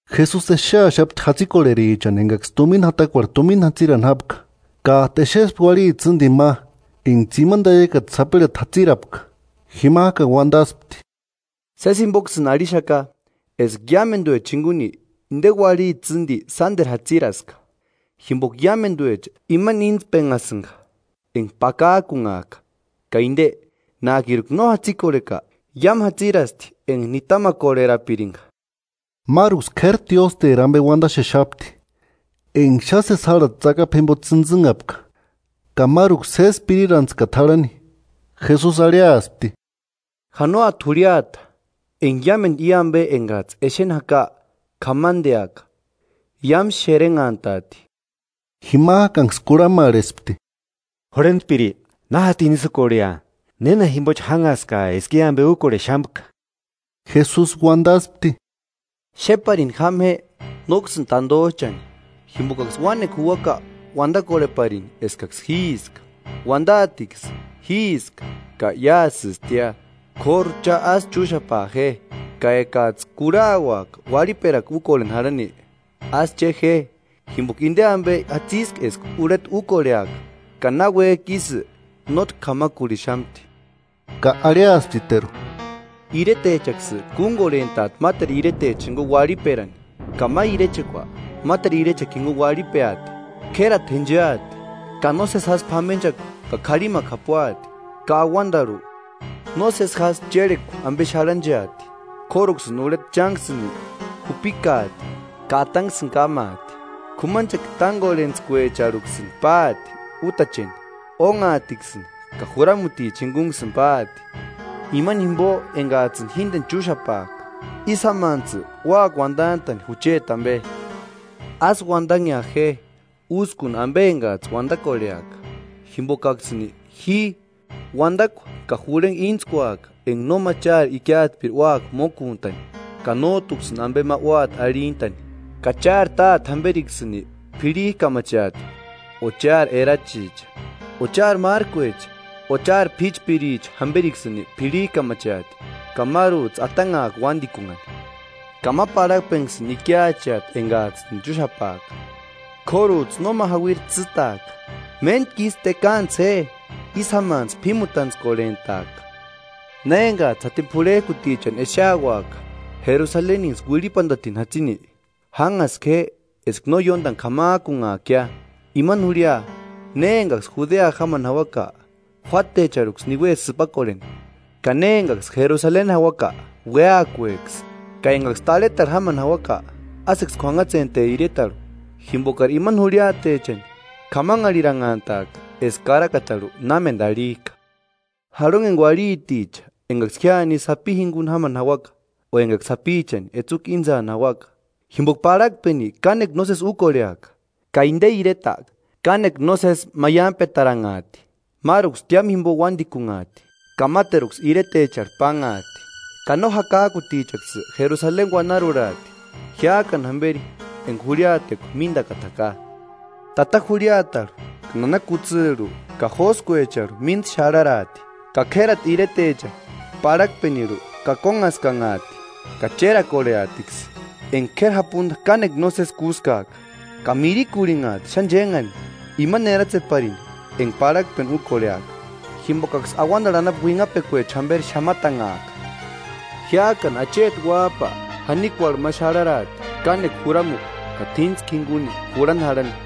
Jesusi exeaxapti jatsikorherichani engaksï tumina jatakuarhu tumina jatsirani jápka, kájtu exespti uarhiti tsïndini ma enga tsimani taiakata sapirhati jatsirapka. Jimajkani uandaspti: –Sési jimboksïni arhixaka eska iámenduecha jinguni inde uarhiti tsîndi sánderu jatsiraska; jimboka iámenduecha imani íntspenhasïnga enga pakajkunhajka, ka inde, nájkiruka no jatsikorheka, iámu jatsirasti enga nitamakorherapiringa. Máruksï k'éri tiósteri ambe uandaxexapti, enga xáni sési járhati tsakapu jimbo tsïntsïnhapka, ka máruksï sési pirirantskata jarhani. Jesusi arhiaspti: 6–Janoati jurhiata enga iámendu i ambe engajtsï exeni jaka k'amandeaka. Iámu xerenhantaati. Jimajkanksï kurhamarhespti: –Jurhentpiri, ¿Na jatini ísï úkorhea? ¿Néna jimbochi jánhaskaa eska i ambe úkorhexamka? Jesusi uandaspti: “Xéparini jáma je nóksïni tandojchani. Jimbokaksï uánekua juuaka uandakorheparini eskaksï jíiska. Uandaatiksï: ‘Jíiska’ ka ‘Iásïstia.’ K'óru cha ásï chúxapaa je. Ka ekajtsï kurhauaka uarhiperakua úkorheni jarhani, ásï che je, jimboka inde ambe jatsiska eska urheta úkorheaka, ka náuejki ísï, nótki k'amarhuxamti.” Ka arhiasptiteru: “Iretechaksï kúngorhentaati máteru iretechani jinguni uarhiperani ka ma irechekua máteru irechekua jinguni uarhipeati. K'érati jéncheati, ka nósesi jásï p'amenchakua ka k'arhimakua japuati, ka auandarhu nósesi jásï chérhekua ambe xarhancheati.” “K'óruksïni urheta chánksïni jupikaati ka atanksïni kámaati. K'umanchekua tángorhentskuecharhuksïni páti útacheni, ónhaatiksïni ka juramutichani jingunksïni páati, imani jimbo engajtsïni jíndeni chúxapajka. Ísï jámantsï úaka uandantani jucheti ambe. Ásï uandanhea je úskuni ambe engajtsï uandakorheaka, jimbokaksïni ji uandakua ka jurhengua íntskuaka enga nóma chári ikiatspiri úaka mókuntani ka nójtuksïni ambe ma úati arhintani. Ka chári táte jamberiksïni p'irhijkamacheati, o chári erachicha, o chári márkuecha o chári p'íchpiricha jamberiksïni p'irhijkamacheati. Ka márujtsï atanhaaka uandikunhani, ka ma parhakpenksïni ikiacheati engajtsïni chúxapaaka; k'órujtsï nóma jauiri tsîtaaka. ¡Méntkisï tekaantsï je, ísï jámantsï p'ímutantskorhentaaka!” “Na engajtsï jatini p'urhejkutichani exeauaka Jerusaleninksï uirhipandatini jatsini, jánhaska je eska no ióndani k'amajkunhaakia. Imani jurhia, ne engaksï Judea jámani jauaka, juátecharhuksï niue sïpakorheni; ka ne engaksï Jerusaleni jauaka, uéakueksï, ka engaksï tarhetarhu jámani jauaka, ásïksï k'uanhatsente iretarhu. Jimbokari imani jurhiatechani k'amanharhiranhantaaka eska karakatarhu námendu arhijka. ¡Jarhonheni uarhiticha engaksï jíani isï sapi jinguni jámani jauaka o engaksï sapichani etsukua íntsani jauaka! Jimboka parhakpeni kánekua nósesi úkorheaka, ka inde ireta kánekua nósesi jásï maiampetaranhaati. Máruksï tiámu jimbo uándikunhaati ka máteruksï iretecharhu pánhaati; ka no jakajkutichaksï Jerusaleni uanarurhaati, jiájkani jamberi enga jurhiatekua míndakata jaka.” “Tata jurhiatarhu ka nana kutsirhu ka jóskuecharhu mínda xarharaati; ka k'érati iretecha parhakpenirhu kakonhaskanhaati ka chérakorheatiskï enga k'éri japunda kánekua nósesi kúskaaka. Ka mirikurhinhaati xáni chénhani imani eratseparini enga parhakpeni úkorheaka; jimbokaksï auandarhu anapu uinhapekuecha jamberi xamatanhaaka. Jiájkani acheti Uájpa janikuarhu ma xarharaati kánekua juramukua ka t'íntskua jinguni jurhani jarhani.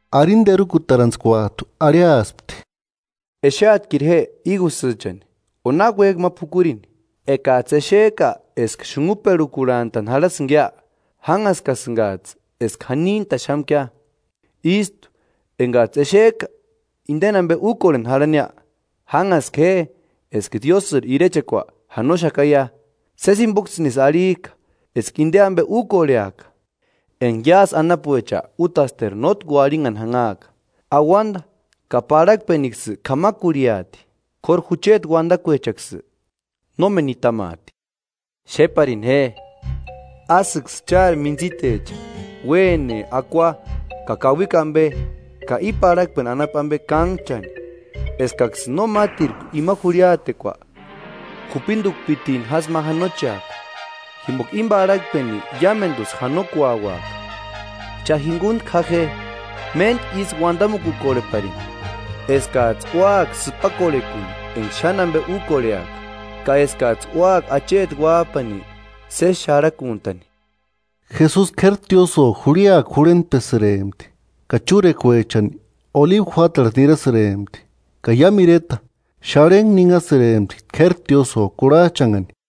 Arini terukutarantskuajtu arhiaspti: “Exeatkiru je ígusïchani o náki uéjki ma p'ukurini. Ekajtsï exejka eska xunhuperhukurhantani jarhasïngia, jánhaskasïngajtsï eska janintaxamkia. Ístu, engajtsï exejka inde ambe úkorheni jarhaniia, jánhaska je eska Diósïri irechekua janoxakaia.” “Sési jimboksïnisï arhijka eska inde ambe úkorheaka, enga iásï anapuecha útasteru nótki uarhinhani janhaaka. Auanda ka parhakpenksï k'amakurhiaati, k'óru jucheti uandakuechaksï nómeni nitamaati.” “Xéparini je, ásïksï chári míntsitecha uéne akua ka kauikua ambe ka i parhakpeni anapu ambe kánhchani, eskaksïni no mátirku ima jurhiatekua jupindukpitini jásï ma janocheaka, jimboka íni parhakpeni iámendusï janokuauaka. Cha jinguntku ja je, méntku isï uandamukukorheparini, eskajtsï úaka sïpakorhekuni enga xáni ambe úkorheaka, ka eskajtsï úaka acheti Uájpani sési xarhakuntani.” Jesusi k'éri tiósïo jurhiakua jurhentpesïrempti, ka chúrekuechani olibu juátarhu nirasïrempti. Ka iámu ireta, xarhentku ninhasïrempti k'éri tiósïo kurhajchanhani.